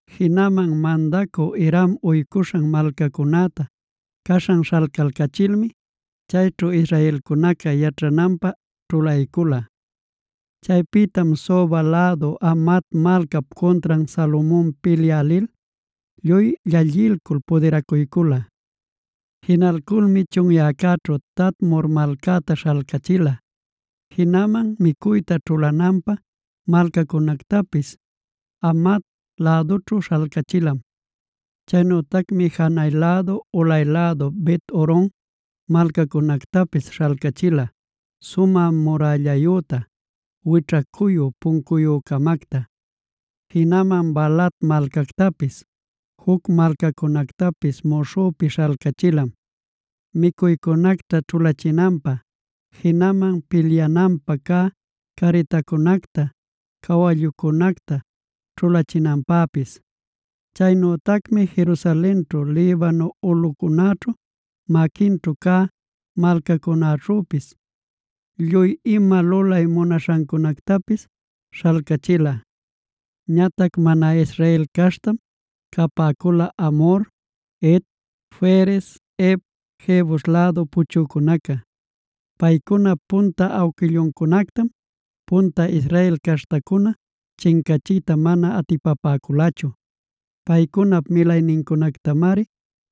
Jinaman mandacü Hiram uycuśhan malcacunäta caśhan śhalcalcachilmi, chayćhu israelcunaca yaćhananpä ćhulaycula. Chaypïtam Soba lädu Hamat malcap cuntran Salomon pilyä lil, lluy llallilcul pudiracuycula. Jinalculmi chunyäcäćhu Tadmor malcacta śhalcachila. Jinaman micuyta ćhulananpä malcacunactapis Hamat lädućhu śhalcachilam. Chaynütacmi janay lädu ulay lädu Bet-horon malcacunactapis śhalcachila sumä murällayüta, wićhacuyu puncuyü-camacta. Jinaman Baalat malcactapis, juc malcacunactapis muśhüpi śhalcachilam micuycunacta ćhulachinanpä, jinaman pilyananpä cä carritancunacta, cawallucunacta ćhulachinanpäpis. Chaynütacmi Jerusalenćhu, Libano ulꞌucunäćhu, maquinćhu cä malcacunäćhüpis lluy ima lulay munaśhancunactapis śhalcachila. Ñatac mana Israel caśhtam capäcula Amhor, Het, Ferez, Hev, Jebus lädu puchücunaca. Paycunap punta awquilluncunactam punta Israel caśhtacuna chincachiyta mana atipapäculachu. Paycunap milaynincunactamari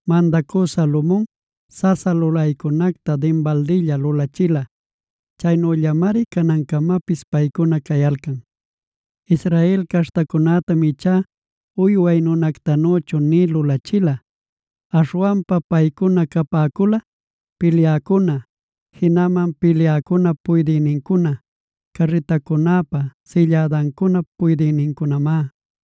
mandacü Salomon sasa lulaycunacta dinbaldilla lulachila. Chaynüllamari canancamapis paycuna cayalcan. Israel caśhtacunätam ichá uyway nunactanüchu nï lulachila. Aśhwanpa paycuna capäcula: pilyäcuna, jinaman pilyäcunap puydïnincuna, carritacunäpa sillädancunap puydïnincunamá.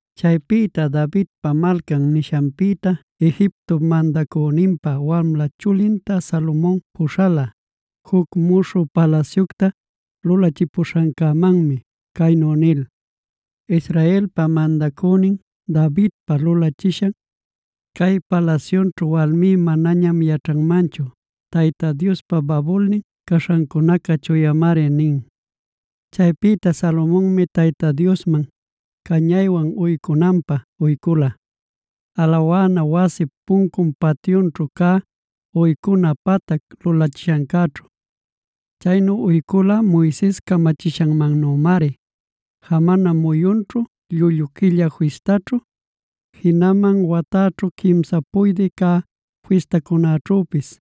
Chaypïta Davidpa Malcan nishanpïta Egiptop mandacüninpä wamla chulinta Salomon puśhala, juc muśhü palasyucta lulachipuśhancämanmi caynu nil: “Israelpa mandacünin Davidpa lulachishan cay palasyunćhu walmí manañam yaćhanmanchu. Tayta Diospa babulnin caśhancunaca chuyamari” nin. Chaypïta Salomonmi Tayta Diosman cañaywan uycunanpä uycula, alawana wasip puncun patyućhu cä uycuna patac lulachishancäćhu. Chaynu uycula Moises camachishanmannümari: jamana muyunćhu,a llullu quilla fistaćhu,b jinaman watäćhu quimsa puydï cä fistacunäćhüpis.c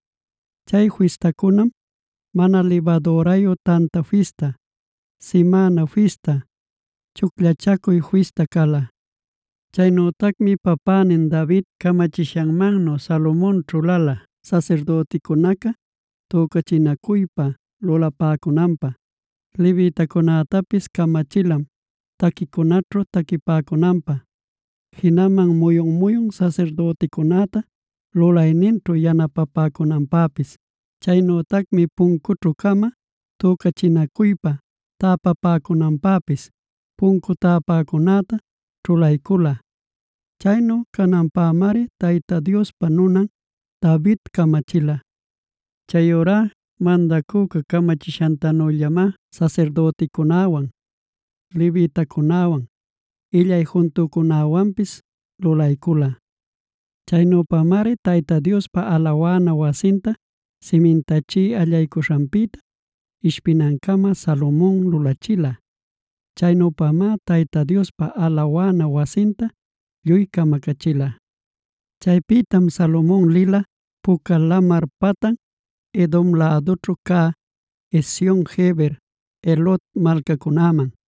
Chay fistacunam: Mana Libadürayu Tanta Fista, Simäna Fista, Chucllachacuy Fista cala. Chaynütacmi papänin David camachishanmannu Salomon ćhulala sasirdüticunaca tücachinacuypa lulapäcunanpä. Levitacunätapis camachilam taquicunaćhu taquipäcunanpä, jinaman muyun-muyun sasirdüticunäta lulayninćhu yanapapäcunanpäpis. Chaynütacmi puncućhu-cama tücachinacuypa täpapäcunanpäpis puncu täpäcunäta ćhulaycula. Chaynu cananpämari Tayta Diospa nunan David camachila. Chayurá mandacüca camachishantanüllamá sasirdüticunäwan, levitacunäwan, illay juntücunäwanpis lulaycula. Chaynüpamari Tayta Diospa alawana wasinta simintachiy allaycuśhanpïta ishpinancama Salomon lulachila. Chaynüpamá Tayta Diospa alawana wasinta lluy camacachila. Chaypïtam Salomon lila Puca Lamar patan Edom lädućhu cä Ezion-geber, Elot malcacunäman.